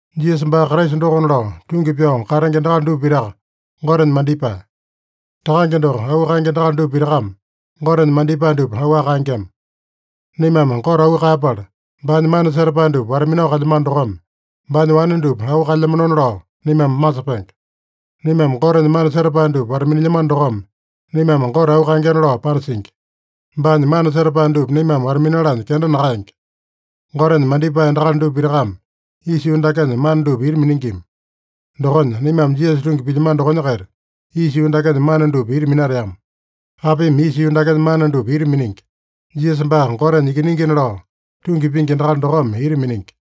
Jisasa baa Kraisa dokona lao tungi pyao katenge endakali dupa pitaka Gotenya mandipae. Takange doko auu kaenge endakali dupa pitakame Gotenya mandipae dupa auwaka kaengema. Naimame Gote auu kaeyapala, baanya mana setapae dupa wata-minao kalyamano dokome, baanya wane dupa auu kaelyamanona lao naimame masepenge. Naimame Gotenya mana setapae dupa wata-minilyamano dokome, naimame Gote auu kaengena lao panasingi. Baanya mana setapae dupa naimame wata-minalanya kenda nakaenge. Gotenya mandipae endakali dupa pitakame isa yuu dakenya mana dupa ita miningima. Dokonya, naimame Jisasa tungi pilyamano dokonya-kaita, isa yuu dakenya mana dupa ita minateama. Apimi isa yuu dakenya mana dupa ita miningi? Jisasa baa Gotenya Ikiningina lao tungi pingi endakali dokome ita miningi.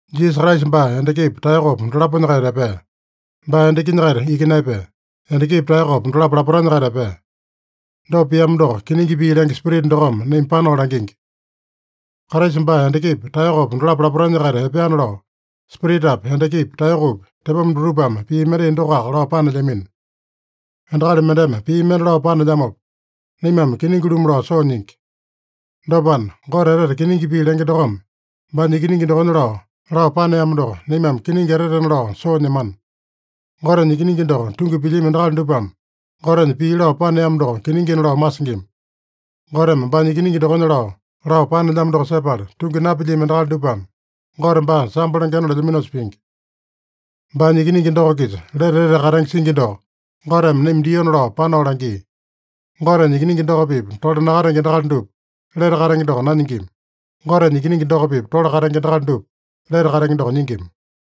Jisasa Kraisa baa endakipa, taeyokopa dolaponya-kaita epea. Baa endakinya-kaita iki naepea. Endakipa, taeyokopa dolapo lapotanya-kaita epea. Dopa piamo doko kiningi pii lenge Spirita dokome naima panao langingi. Kraisa baa endakipa, taeyokopa dolapo lapotanya-kaita epeana lao, Spiritapi, endakipi, taeyokopi tepoma dutupame pii mendai dokoaka lao panelyamino. Endakali mendeme pii mende lao panelyamopa, naimame kiningi-lumu lao soo nyingi. Dopana, Gote etete kiningi pii lenge dokome baanya Ikiningi dokonya lao, lao paneamo doko, naimame kiningi etetena lao soo nyemana. Gotenya Ikiningi doko tungi pilyami endakali dupame Gotenya pii lao paneamo doko kiningina lao masingima. Goteme baanya Ikiningi dokonya lao, lao panelyamo doko sepala tungi napilyami endakali dupame, Gote baa sambo lengena lelyaminosa pingi. Baanya Ikiningi doko-kisa lete etete katenge singi doko, Goteme naima diona lao panao langia. Gotenya Ikiningi doko-pipa tole nakatenge endakali dupa lete katenge doko nanyingima. Gotenya Ikiningi doko-pipa tole katenge endakali dupa lete katenge doko nyingima.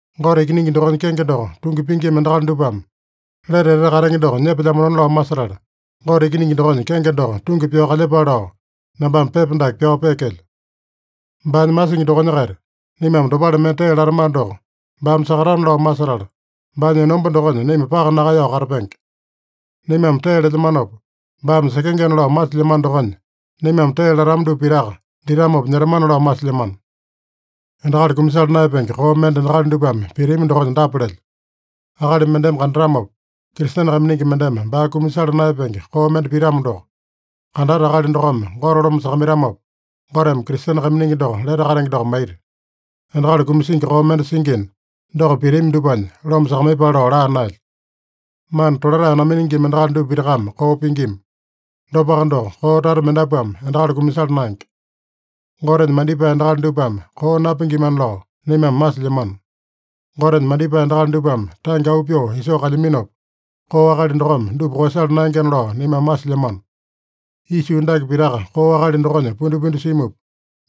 Gote Ikiningi dokonya kenge doko tungi pingima endakali dupame lete etete katenge doko nyepelyamanona lao masetala, Gote Ikiningi dokonya kenge doko tungi pyao kalyepale lao, nambame pepa dake pyao peekelyo. Baanya masingi dokonya-kaita naimame dopale mende tee latamano doko, baame sakatana lao masetala, baanya enomba dokonya naima paka nakaeyao katapenge. Naimame tee lelyamanopa baame sekengena lao masilyamano dokonya, naimame tee latama dupa pitaka ditamopa nyetamana lao masilyamano. Endakali kumasala naeyapenge koo mende endakali dupame pitami dokonya dapa lelyo: Akali mendeme kandatamopa, Kristene kaiminingi mendeme baa kumasala naeyapenge koo mende pitamo doko, kandata akali dokome Gote loma sakamaitamopa, Goteme Kristene kaiminingi doko lete katenge doko maita. Endakali kumasingi koo mende singina, doko pitami dupanya loma sakamaiyepale lao laa naelyo. Mana tolatae naminingima endakali dupa pitakame koo pingima. Dopaka doko, koo tata mendapuame endakali kumasala naenge. Gotenya mandipae endakali dupame koo napingimana lao naimame masilyamano. Gotenya mandipae endakali dupame tange auu pyoo isoo kalyaminopa, koo akali dokome dupa koeyasala naengena lao naimame masilyamano. Isa yuu dake pitaka koo akali dokonya pundipundi simupa,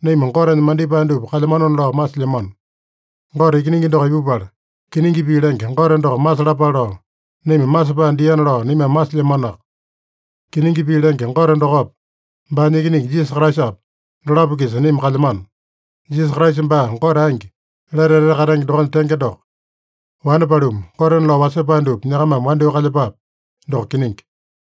naima Gotenya mandipae dupa kalyamanona lao masilyamano. Gote Ikiningi doko ipupala, kiningi pii lenge Gote doko masalapale lao, naima masepae diana lao naimame masilyamanoaka. Kiningi pii lenge Gote dokopa, baanya Ikiningi Jisasa Kraisapa, dolapo-kisa naima kalyamano. Jisasa Kraisa baa Gote angi, lete etete katenge dokonya tenge doko. Wane paluma, gotena lao wasepae dupa nyakamame wandyoo kalyepape. Doko kiningi.